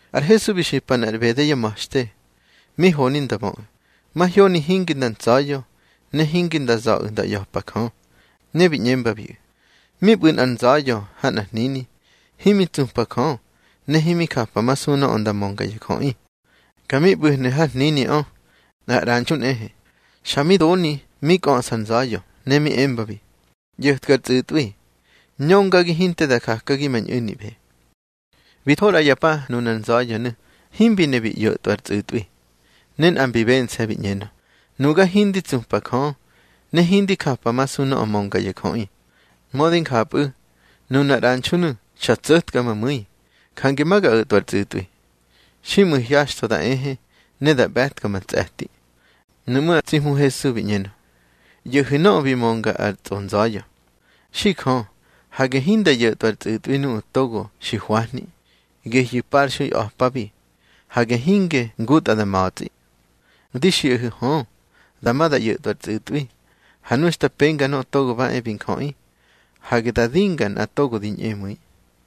Ar Hesu bi xipa nꞌar ꞌbede yá ma̱xte, mi honi nda böꞌu̱, mahyoni hinge nda ntsa̱ya̱, ne hinda za̱ꞌu̱ nda ꞌya̱pa Jö. Ne bi ꞌñembabiꞌu̱: —Mi ꞌbu̱ nꞌar nza̱ya̱ ha nꞌar hnini, himi tsupa Jö, ne himi japamasu nöꞌö nda mönga ya jöꞌi. Ka mi ꞌbu̱hnu̱ har hniniꞌö nꞌar ꞌranxu nꞌehe. Xa mi doni mi kꞌöꞌsa ar nza̱ya̱, ne mi embabi: ꞌYo̱tka ar tsꞌu̱tꞌwi, ñöngagi hinte da jakagi ma ñꞌu̱niꞌbe. Bi tho ꞌra ya pa nunar nza̱ya̱nu̱ himbi ne bi ꞌyo̱tꞌwa ar tsꞌu̱tꞌwi. Ne nꞌa mbi bense̱, bi ꞌñenö: Nuga hindi tsupa Jö, ne hindi japamasu nöꞌö mönga ya jöꞌi. Mödi njapꞌu̱, nunar ꞌranxunu̱ xa tso̱tka ma mu̱i. Jange ma ga o̱tꞌwa ar tsꞌu̱tꞌwi, xiꞌmu̱ hyaxtho da ehe, ne da ꞌbe̱tka ma tse̱ti. Nuꞌmú̱ ar tsi Hmu Hesu bi ꞌñenö: —ꞌYo̱hu̱ nöꞌö bi mönga ar tsꞌonza̱ya̱. Xi Jö, hage hinda ꞌyo̱tꞌwa ar tsꞌu̱tꞌwi nuꞌu̱ togo xi hwahni, gehyu̱ parxui a̱pabi. Hage hinge ngutꞌa da ma̱tsꞌi. Di xiꞌahu̱ hö, dama da ꞌyo̱tꞌwa ar tsꞌu̱tꞌwi. Ha nu xta penga Nöꞌö Togo ba e bi Njöꞌi, hage da dinga nꞌa togo di ñꞌemu̱i.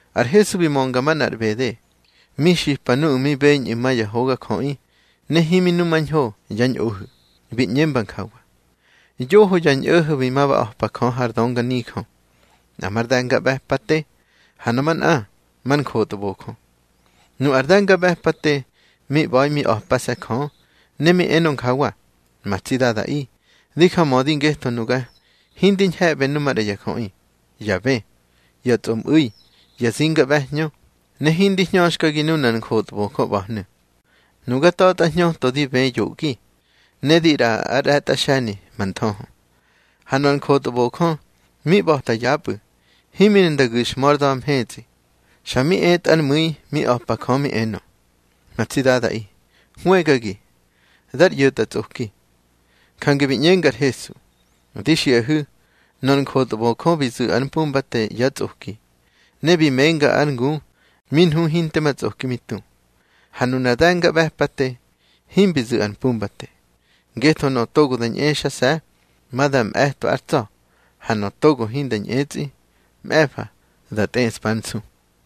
Ar Hesu bi mönga manꞌar ꞌbede, mi xipa nuꞌu̱ mi beñꞌu̱ ma ya hogajöꞌi ne himi numañho yá ñꞌohu̱. Bi ꞌñemba njawa: —Yoho ya ñꞌo̱ho̱ bi ma ba a̱pa Jö har dönganijö, nꞌa mar de̱ngaꞌbe̱pate, ha nöꞌö manꞌa mar njotbojö. Nu ar de̱ngaꞌbe̱pate mi ꞌba̱i mi a̱pase̱ Jö, ne mi enö njawa: Ma tsi Dadaꞌi, di jamödi ngetho nuga hindi ñhe̱ꞌbe nu maꞌra ya jöꞌi, ya bë, ya tsꞌomꞌu̱i, ya zinga ꞌbe̱hñö, ne hindi hñöxkagi nunar njotbojö ꞌba̱hnu̱. Nuga ta̱tꞌa hñöto di bë yoꞌgi, ne di ꞌraꞌa ár ꞌre̱tꞌa xe̱ni ma nthöhö. Ha nöꞌö ar njotbojö mi ꞌba̱ta yapꞌu̱, himi ne nda gu̱xhmö ár da̱ mhetsꞌi. Xa mi etꞌa ár mu̱i mi a̱pa Jö, mi enö: Ma tsi Dadaꞌi, hwëgagi, dar ꞌyo̱tꞌatsꞌoki. Jange bi ꞌñenga ar Hesu: —Di xiꞌahu̱, nöꞌö ar njotbojö bi zu̱ ár mpumbate yá tsꞌoki, ne bi menga ár ngu mi nhu hinte ma tsꞌoki mi tu. Ha nunar de̱ngaꞌbe̱pate himbi zu̱ ar mpumbate. Ngetho nöꞌö togo da ñꞌexase̱, ma da mꞌe̱twa ár tsa̱. Ha nöꞌö togo hinda ñꞌetsꞌi, mꞌe̱fa da tꞌeꞌspa ár nsu.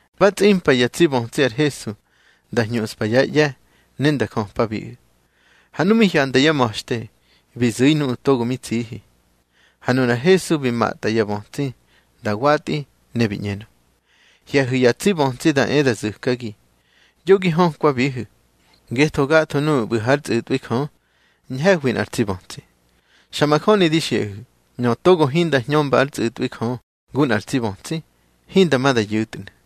Ba tsꞌimpa ya tsi bötsi ar Hesu nda hñuꞌspa yá ꞌye̱ ne nda jöpabiꞌu̱. Ha nu mi hyanda yá ma̱xte, bi zu̱i nuꞌu̱ togo mi tsihi. Ha nunar Hesu bi matꞌa ya bötsi nda watꞌi, ne bi ꞌñenö: —Hye̱hu̱ ya tsi bötsi da e da zu̱kagi, yo gi hökwabihu̱. Ngetho gatho nuꞌu̱ ꞌbu̱ hár tsꞌu̱tꞌwi Jö, ñhe̱hwi nꞌar tsi bötsi. Xa majöni di xiꞌahu̱, nöꞌö togo hinda hñömba ár tsꞌu̱tꞌwi Jö ngu nꞌar tsi bötsi, hinda ma da yu̱tnu̱.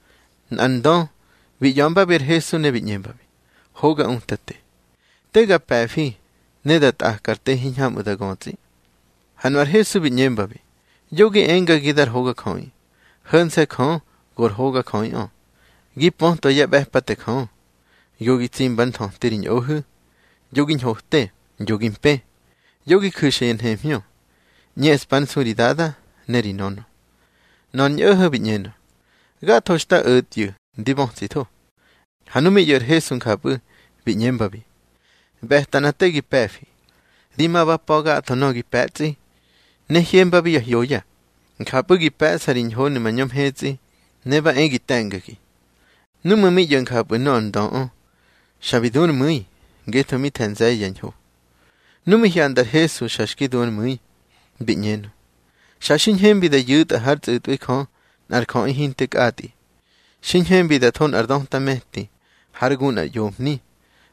Nꞌar ndö bi ꞌya̱mbabi ar Hesu, ne bi ꞌñembabi: —Hoga Utate, te ga pe̱fi ne da tꞌaka ar te hiñhamꞌu̱ da götsꞌi. Ha nu ar Hesu bi ꞌñembabi: —Yoꞌö gi engagi dar hogajöꞌi. Ho̱nse̱ Jö go ar hogajöꞌiꞌö. Gi pötwa yá ꞌbe̱pate Jö: Yo gi tsimba ár nthöti ri ñꞌohu̱, yo gi ñhote, yo gi mpë, yo gi ju̱xa ya nhemhñö, ꞌñeꞌspa ár nsu ri dada ne ri nönö. Nöꞌö ar ñꞌo̱ho̱ bi ꞌñenö: —Gatho xta o̱tyu̱ ndi bötsitho. Ha nu mi ꞌyo̱ ar Hesu njapꞌu̱, bi ꞌñembabi: —ꞌBe̱ta nꞌa te gi pe̱fi. Di ma ba pa̱ gatho nöꞌö gi pe̱tsꞌi, ne hyembabi ya hyoya. Njapꞌu̱ gi pe̱ꞌsa ri ñhonu̱ mañö mhetsꞌi. Ne ba e gi te̱ngagi. Núꞌmu̱ mi ꞌyo̱ njapꞌu̱ nöꞌö ar ndöꞌö, xa bi du ár mu̱i, ngetho mi the̱ nze̱ye̱ yá ñho. Nu mi hyanda ar Hesu xa xki du ár mu̱i, bi ꞌñenö: —Xa xi ñhembi da yu̱tꞌa hár tsꞌu̱tꞌwi Jö nꞌar jöꞌi hinte kꞌatꞌi. Xi ñhembi da tho nꞌar döta me̱ti hár gu nꞌar ꞌyomhni,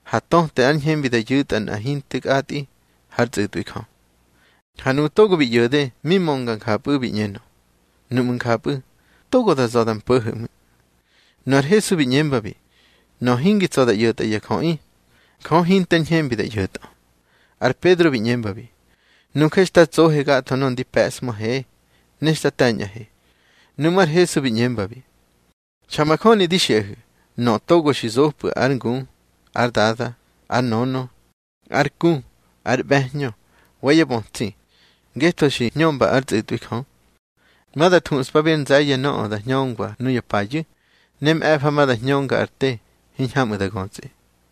ha töte ár ñhembi da yu̱tꞌa nꞌa hinte kꞌatꞌi hár tsꞌu̱tꞌwi Jö. Ha nuꞌu̱ togo bi ꞌyo̱de mi mönga njapꞌu̱, bi ꞌñenö: —Nuꞌmu̱ njapꞌu̱, togo da za̱ da mpo̱ho̱ ꞌmu̱. Nu ar Hesu bi ꞌñembabi: —Nöꞌö hingi tsa̱ da ꞌyo̱tꞌa ya jöꞌi, Jö hinter ñhembibi da ꞌyo̱tꞌö. Ar Pedro bi ꞌñembabi: —Nuje xta tsohe gatho nöꞌö ndi pe̱ꞌshmöhe ne xta te̱ñꞌahe. Nuꞌmú̱ ar Hesu bi ꞌñembabi: —Xa majöni di xiꞌahu̱, nöꞌö togo xi zopꞌu̱ ár ngu, ár dada, ár nönö, ár ku, ár ꞌbe̱hñö, wa yá bötsi, ngetho xi hñömba ár tsꞌu̱tꞌwi Jö, ma da thuꞌspabi ár nze̱ye̱ nöꞌö da hñöngwa nuya payu̱, ne mꞌe̱fa ma da hñönga ar te hiñhamꞌu̱ da götsꞌi.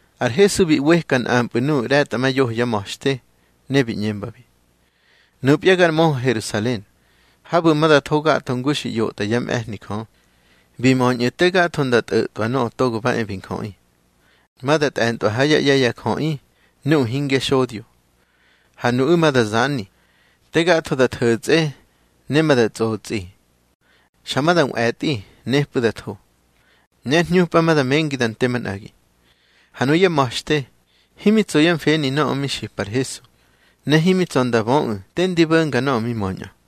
Ar Hesu bi ꞌweka nꞌampꞌu̱ nuꞌu̱ ꞌre̱tꞌamayoho yá ma̱xte, ne bi ꞌñembabi: —Nupya gar möhö Herusalen, habu̱ ma da tho gatho ngu xi ꞌyotꞌa yá mꞌe̱hni Jö, bi möñꞌu̱ te gatho nda tꞌo̱tꞌwa Nöꞌö Togo ba e bi Njöꞌi. Ma da tꞌe̱ntꞌwa yá ꞌye̱ ya jöꞌi nuꞌu̱ hingyá xodyo. Ha nuꞌu̱ ma da zani, te gatho da tho̱tsꞌe, ne ma da tsꞌotsꞌi. Xa ma da nꞌwe̱tꞌi, nepꞌu̱ da tho. Ne ár hñupa ma da mengi da nte manꞌagi. Ha nuyá ma̱xte himi tso yá mfeni nöꞌö mi xipa ar Hesu, ne himi tsa̱ nda böꞌu̱ te ndi bo̱nga nöꞌö mi möñꞌö.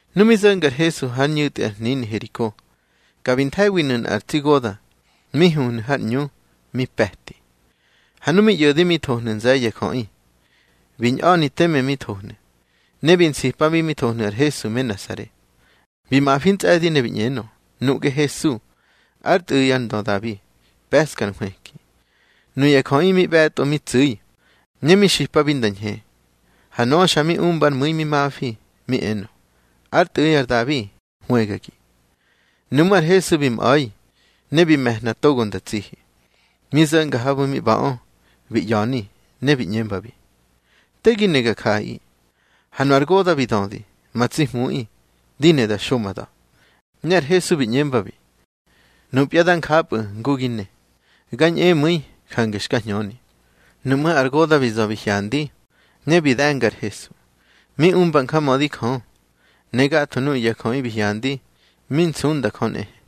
Nu mi zo̱nga ar Hesu hár ñu̱tꞌi ar hnini Heriko, ka bi nthe̱winu̱ nꞌar tsi goda̱ mi huhnu̱ har ꞌñu, mi pe̱ti. Ha nu mi ꞌyo̱de mi thohnu̱ nze̱ye̱ ya jöꞌi, bi ñꞌa̱ni teme mi thohnu̱. Ne bi nsipabi mi thohnu̱ ar Hesu me Nasare. Bi mafi ntsꞌe̱di ne bi ꞌñenö: —Nuꞌge Hesu, ár Tꞌu̱ꞌi ar ndö Dabi, pe̱ꞌska ar nhwëki. Nuya jöꞌi mi ꞌbe̱tꞌo mi tsu̱i, ne mi xipabi nda ñhe. Ha nöꞌö xa mi umba ár mu̱i mi mafi mi enö: —Ár Tꞌu̱ꞌi ar Dabi, hwëgagi. Nuꞌmú̱ ar Hesu bi mꞌa̱i, ne bi me̱hna togo nda tsihi. Mi zo̱nga habu̱ mi ꞌba̱ꞌö, bi ꞌya̱ni, ne bi ꞌñembabi: —Te gi ne ga jaꞌaꞌi. Ha nu ar goda̱ bi dödi: —Ma tsi Hmuꞌi, di ne da xo ma da̱. Ne ar Hesu bi ꞌñembabi: —Nupya dá njapꞌu̱ ngu gi ne. Ga ñꞌemu̱i, jange xka hñöni. Nuꞌmú̱ ar goda̱ bi za̱ bi hyandi, ne bi de̱nga ar Hesu, mi umba njamödi Jö. Ne gatho nuꞌu̱ ya jöꞌi bi hyandi, mi nsunda Jö nꞌehe.